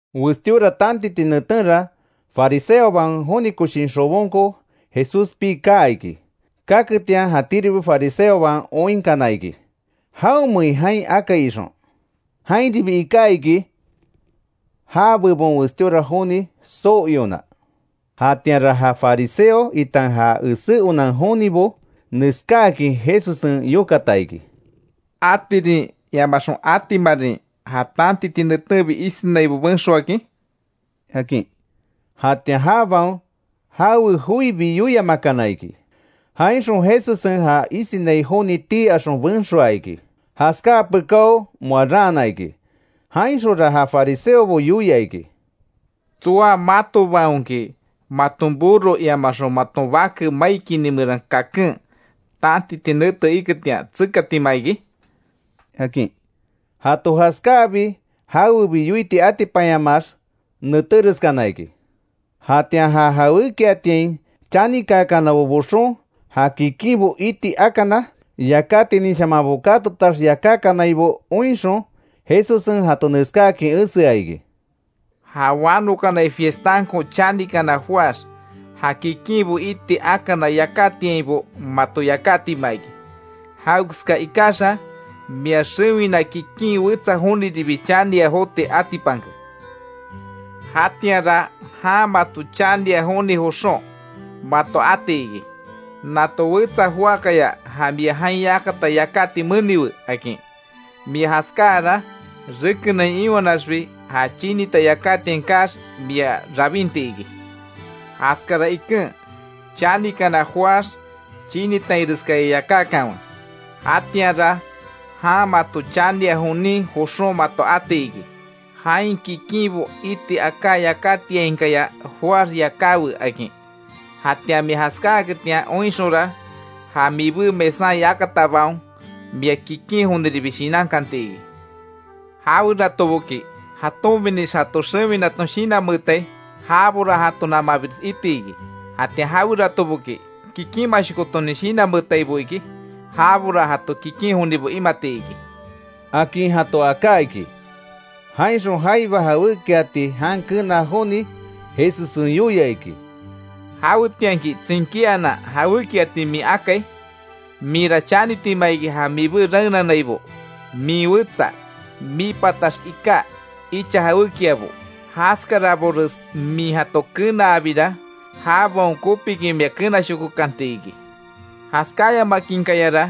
Westíora tantiti netenra, fariseobaon joni koshin xobonko Jesús pii kaa iki. Kaketian jatíribi fariseobaon oinkana iki; jawemein jain akai ixon. Jainribi iká iki, já bebon westíora joni soo iona. Jatianra ja fariseo itan ja esé onan jonibo, neskáakin Jesussen yokata iki: —¿Atirin iamaxon atimarin ja tantiti netenbi isinaibo benxoakin? —akin. Jatian jabaon jawe joibi yoiamakana iki, jainxon Jesussen ja isinai joni tii axon benxoa iki, jaskáa pekáo moa raana iki. Jainxonra ja fariseobo yoia iki: —¿Tsoa matobaonki, maton burro iamaxon maton bake mai kini meran kaken tantiti nete iketian tsekatima iki? —akin. Jato jaskáabi jawebi yoiti atipanyamaax netéreskana iki. Jatian ja jawékiatiain chanikanabo boxon, ja kikinbo iti akana yakátininshamanbo katotax yakákanaibo oinxon, Jesussen jato neskáakin esea iki: —Ja wanokanai fiestanko chanikana joáx, ja kikinbo iti akana yakátiainbo mato yakátima iki. Jawekeska ikaxa mia xewina kikin wetsa joniribi chania joti atipanke. Jatianra jan mato chania joni joxon mato ati iki: ‘Nato wetsa joákaya ja mia jain yakata yakáti meniwe’, akin. Mia jaskáara rekenain iwanaxbi ja chinita yakátiain kaax mia rabinti iki. Jaskara iken, chanikana joáx chinitainreskaya yakákanwe; jatianra jan mato chania jonin joxon mato ati iki: ‘Jain kikinbo iti aká yakátiainkaya joáx yakáwe’, akin. Jatian mia jaskáketian oinxonra, ja mibé mesan yakatabaon, mia kikin joniribi shinankanti iki. Jaweratoboki jatonbinix jato xewinaton shinanmeetai, jabora jato namanbires iti iki, jatian jaweratoboki, kikinmashokotonin shinanmeetaibo iki, jabora jato kikin jonibo imati iki —akin jato aká iki. Jainxon, jaiba jawékiati jan kenaa joni Jesussen yoia iki: —Jawetianki tsinkíanan jawékiati min akai, minra chanitima iki, ja mibé raenanaibo, min wetsa, mii patax iká icha jawékiabo; jaskarabores min jato kenaabira, jabaon kopikin mia kenashokokanti iki. Jaskáyamakinkayara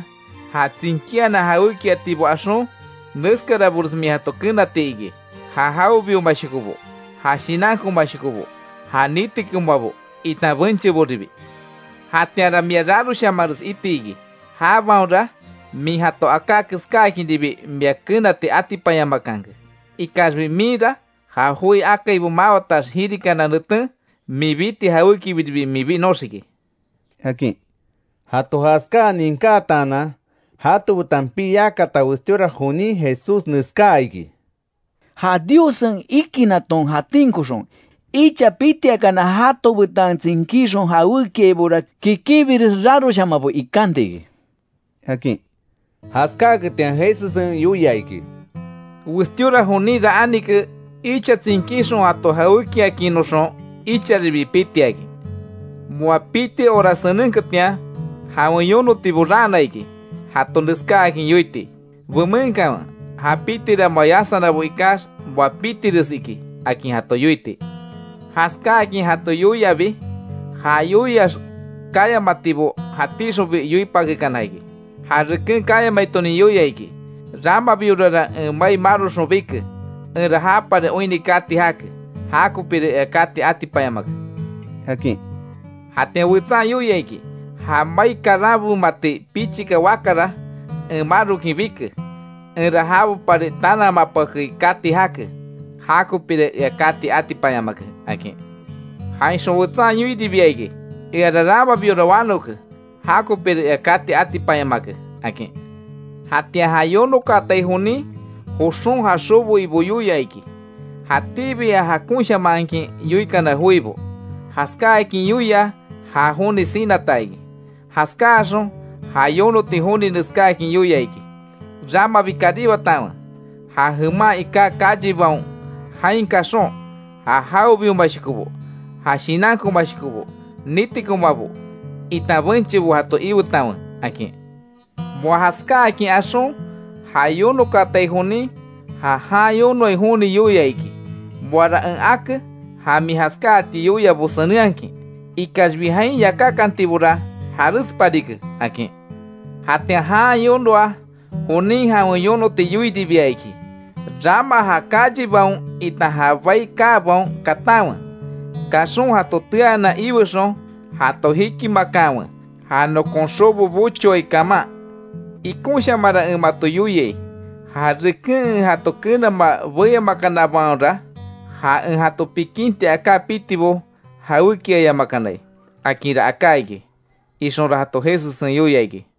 ja tsinkíanan jawékiatibo axon, neskarabores min jato kenati iki. Ja jawebiomashokobo, ja shinankomashokobo, ja nitikomabo itan bencheboribi. Jatianra mia raroshamanres iti iki, jabaonra min jato aká keskáakinribi mia kenati atipanyamakanke. Ikaxbi minra ja joi akaibo mawatax jirikana neten min biti jawékibiribi min binoxiki —akin. Jato jaskáa ninkátaanan, jato betan pii yakata westíora jonin Jesús neskáa iki: —¡Ja Diossen ikinaton jatinkoxon, icha pitiakana jato betan tsinkíxon jawékiaibora, kikinbires raroshamanbo ikanti iki! —akin. Jaskáaketian Jesussen yoia iki: —Westíora joninra anike, icha tsinkixon jato jawékiakinnoxon, icharibi pitiakin. Moa piti hora senenketian, jawen yonotibo raana iki, jato neskáakin yoiti: ‘Bemenkanwe ja pitira moa yasanabo ikax, moa pitires iki’, akin jato yoiti. Jaskáakin jato yoiabi, ja yoiax kayamatibo jatíxonbi yoipakekana iki. Ja reken kayamaitonin yoia iki: ‘Ramabiorara en mai maroxon bike, enra japari oinni kati jake. Jakopira ea kati atipanyamake’, akin. Jatian wetsan yoia iki: ‘Ja mai karanbemati pichika wakara en marokin bike; enra jabopari tanamapakei kati jake. Jakopira ea kati atipanyamake’, akin. Jainxon wetsan yoiribia iki: ‘Eara ramabiora wanoke jakopira ea kati atipanyamake’, akin. Jatian ja yonokaatai jonin, joxon ja xobo ibo yoia iki. Jatíbi ja jokashamakin yoikana joibo, jaskáakin yoia, ja joni sinata iki. Jaskáaxon ja yonoti joni neskáakin yoia iki: ‘Ramabi karibatanwe ja jeman iká callebaon; jain kaxon, ja jawebiomashokobo, ja shinankomashokobo, nitikomabo itan benchebo jato iwetanwe’, akin. Moa jaskáakin axon ja yonokaatai jonin, ja jan yonoai joni yoia iki: ‘Moara en ake, ja min jaskáati yoiabo senenhakin, ikaxbi jain yakákantibora jarésparike’, akin. Jatian jan yonoa jonin jawen yonoti yoiribia iki: ‘Rama ja callebaon itan ja bai kaabaon katanwe, kaxon jato teanan iwexon, jato jikimakanwe, ja nokon xobo bochoai kaman. Ikonshamanra en mato yoiai, ja reken en jato kenamaa beyamakanabaonra, ja en jato pikinti aká pitibo jawékiayamakanai’, akinra aká iki —ixonra jato Jesussen yoia iki.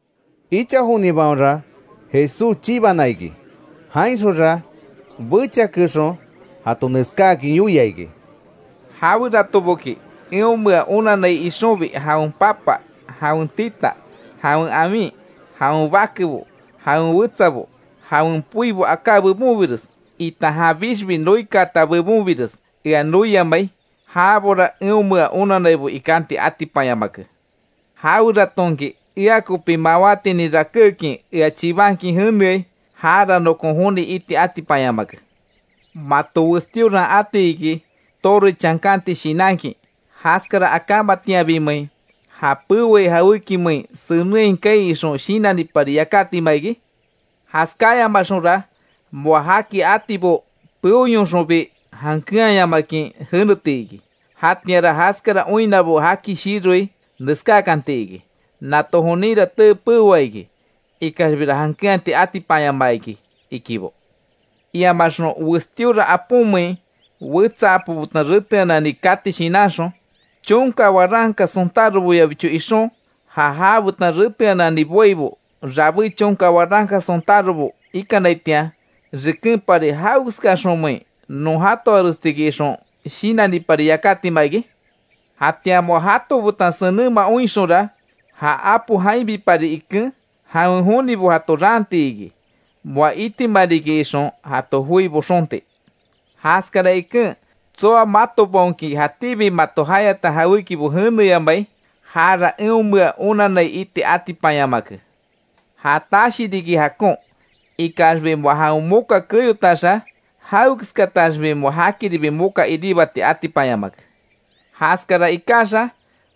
Icha jonibaonra Jesús chibana iki, jainxonra bechiakexon jato neskáakin yoia iki: “Jaweratoboki eonmea onanai ixonbi, jawen papa, jawen tita, jawen awin, jawen bakebo, jawen wetsabo, jawen poibo aká bebonbires, itan janbixbi noikaata bebonbires ea noiamai, jabora eonmea onannaibo ikanti atipanyamake. Jaweratonki ea kopi mawátinin rakékin, ea chibankin jeneai, jara nokon joni iti atipanyamake. Mato westíoran ati iki, torre chankanti shinankin ¿Jaskara akámatianbimein, ja peoai jawékimein senenhai kaai ixon shinanipari yakátima iki? Jaskáyamaxonra moa jaki atibo peoyonxonbi, jankeanyamakin jeneti iki. Jatianra jaskara oinnabo jaki shiroi, neskákanti iki: ‘Nato joninra tee peoa iki; ikaxbira jankeanti atipanyamaa iki’, ikibo. Iamaxon westíora aponmein wetsa apo betan reteanani kati shinanxon ¿Chonka waranka sontároboyabicho ixon, ja jabetan reteanani boaibo rabé chonka waranka sontárobo ikanaitian, rekenpari jawekeskaxonmein non jatoarestiki ixon, shinanipari yakátima iki? Jatian moa jato betan senenma oinxonra, ja apo jainbipari iken, jawen jonibo jato raanti iki. Moa itima riki ixon, jato joi boxonti. Jaskara iken tsoa matobaonki jatíbi mato jayata jawékibo jeneyamai, jara eonmea onanai iti atipanyamake. Ja tashi riki jakon, ikaxbi moa jawen moka keyotaxa; jawekeskataxbi moa jakiribi moka iribati atipanyamake. Jaskara ikaxa,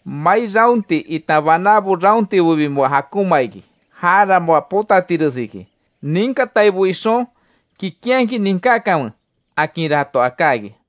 mai raonti itan banábo raontibobi moa jakonma iki. Jara moa potatires iki. Ninkataibo ixon, kikinhakin ninkákanwe”, akinra jato aká iki.